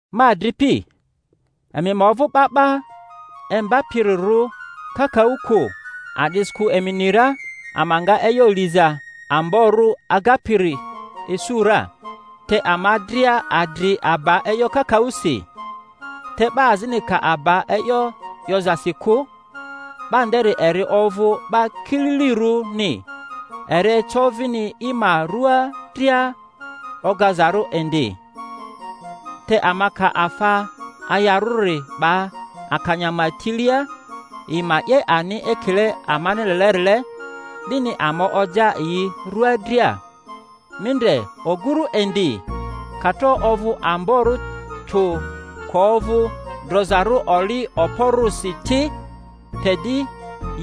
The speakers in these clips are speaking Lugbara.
Ma adripi, emi ma ovᴜ 'ba 'ba imbapirirᴜ kakaᴜ kᴜ, a'disikᴜ emi ni ra ama nga e'yo liza amborᴜ agapiri Isu ra. Te ama dria adri aba e'yo kakaᴜsi. Te 'ba azini ka aba e'yo 'yozasi kᴜ, 'ba nderi eri ovᴜ 'ba kililirᴜni, eri eco vini i ma rua dria ogazarᴜ indi. Te ama ka afa ayarᴜri 'ba akanya ma tilia, yi ma 'ye ani ekile amani lelerile, 'dini ama oja yi rᴜa dria. Mi ndre oguru indi; ka tro ovᴜ amborᴜ tᴜ, ka ovᴜ drozarᴜ oli okporᴜsi ti, te di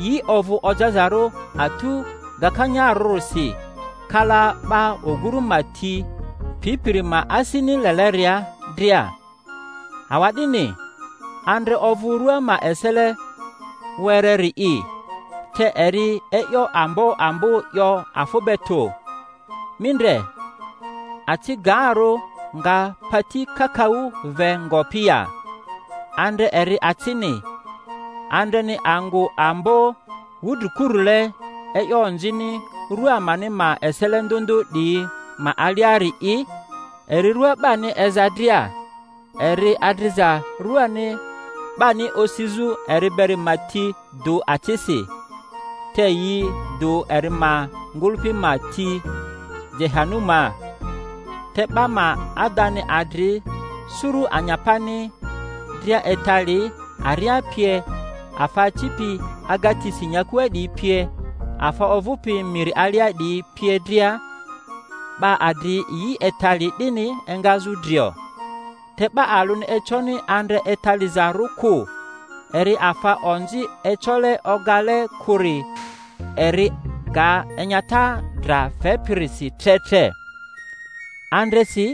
yi ovᴜ ojazarᴜ atu gakanyarᴜrisi kala 'ba oguru ma ti pipiri ma asini leleria dria. Awa'dini andre ovᴜ rua ma esele wereri'i, te eri e'yo ambo ambo 'yo afᴜ be tᴜ. Mi ndre, aci gaarᴜ nga pati kakaᴜ ve ngopi ya! Andre eri acini. Andreni angᴜ ambo wudrikurule e'yo onzini rua amani ma esele ndᴜ ndᴜ 'diyi ma aliari'i, eri rua 'bani eza dria, eri adriza rᴜani 'bani osizᴜ eri beri ma ti dᴜ acisi, te yi dᴜ eri ma ngᴜlᴜpi ma ti Jehanumaa. Te 'ba ma adani adri suru anyapani dria etali, aria pie, afa acipi agatisi nyakua 'diyi pie, afa ovᴜpi miri alia 'diyi pie dria, 'ba adri yi etali 'dini engazᴜ drio, te 'ba alᴜni econi andre etalizarᴜ kᴜ—eri afa onzi ecole ogale kᴜri, eri ga enyata dra fepirisi tre tre. Andresi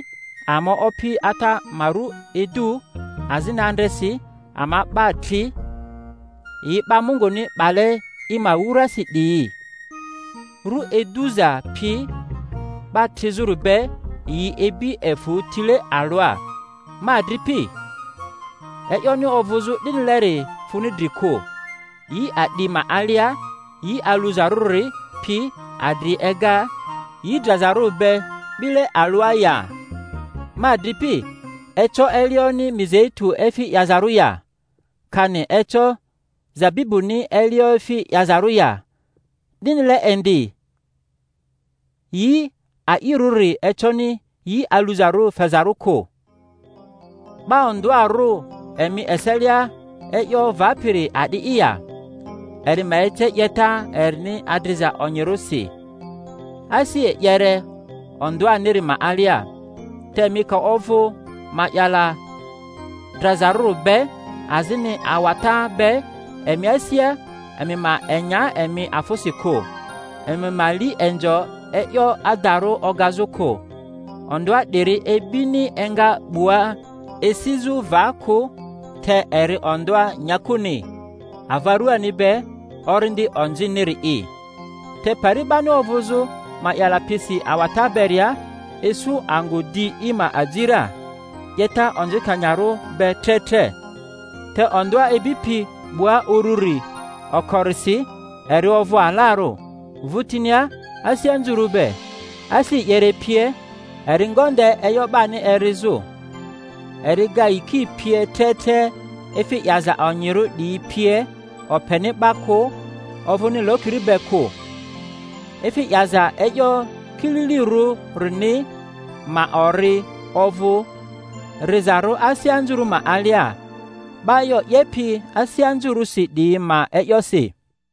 ama Opi Ata ma ru idu, azini andresi ama 'ba tri, yi 'ba Munguni 'bale i ma wurasi 'diyi. Ru iduza pi 'ba trizᴜri be yi ibi efᴜ tile alᴜa. Ma adripi, e'yoni ovᴜzᴜ 'dinileri funi dri kᴜ. Yi a'di ma alia, yi aluzarᴜri pi adri ega yi drazarᴜri be 'bile alᴜa ya? Ma adripi, eco elioni mizeitu efi 'yazarᴜ ya, kani eco zabibᴜni elio efi 'yazarᴜ ya? 'Dinile indi yi a'irᴜri econi yi aluzarᴜri fezarᴜ kᴜ. 'Ba ondᴜarᴜ emi eselia e'yo vapiri a'di'i ya? Eri ma ece 'yeta erini adriza onyirᴜsi, asi e'yere ondᴜaniri ma alia. Te emi ka ovᴜ ma'yala drazarᴜri be azini awata be emi asia, emi ma enya emi afᴜsi kᴜ, emi ma li inzo e'yo adarᴜ ogazᴜ kᴜ. Ondᴜa 'diri ibini enga 'bua esizᴜ va kᴜ, te eri ondᴜa nyakuni, ava ruani be, orindi onziniri'i. Te pari 'bani ovᴜzᴜ ma'yala pisi awata beria, isu angᴜ di i ma aji ra, 'yeta onzikanyarᴜ be tre tre. Te ondᴜa ibipi 'bua ururi, okorisi eri ovᴜ alarᴜ, vᴜtinia asi anzurᴜ be, asi e'yere pie, eri ngonde e'yo 'bani erizᴜ, eri ga yiki pie tre tre efi 'yaza onyirᴜ 'diyi pie, openi 'ba kᴜ, ovᴜni lokiri be kᴜ. Efi 'yaza e'yo kililirᴜrini ma ori ovᴜ rizarᴜ asi anzurᴜ ma alia, 'ba e'yo 'yepi asi anzurᴜsi 'diyi ma e'yosi.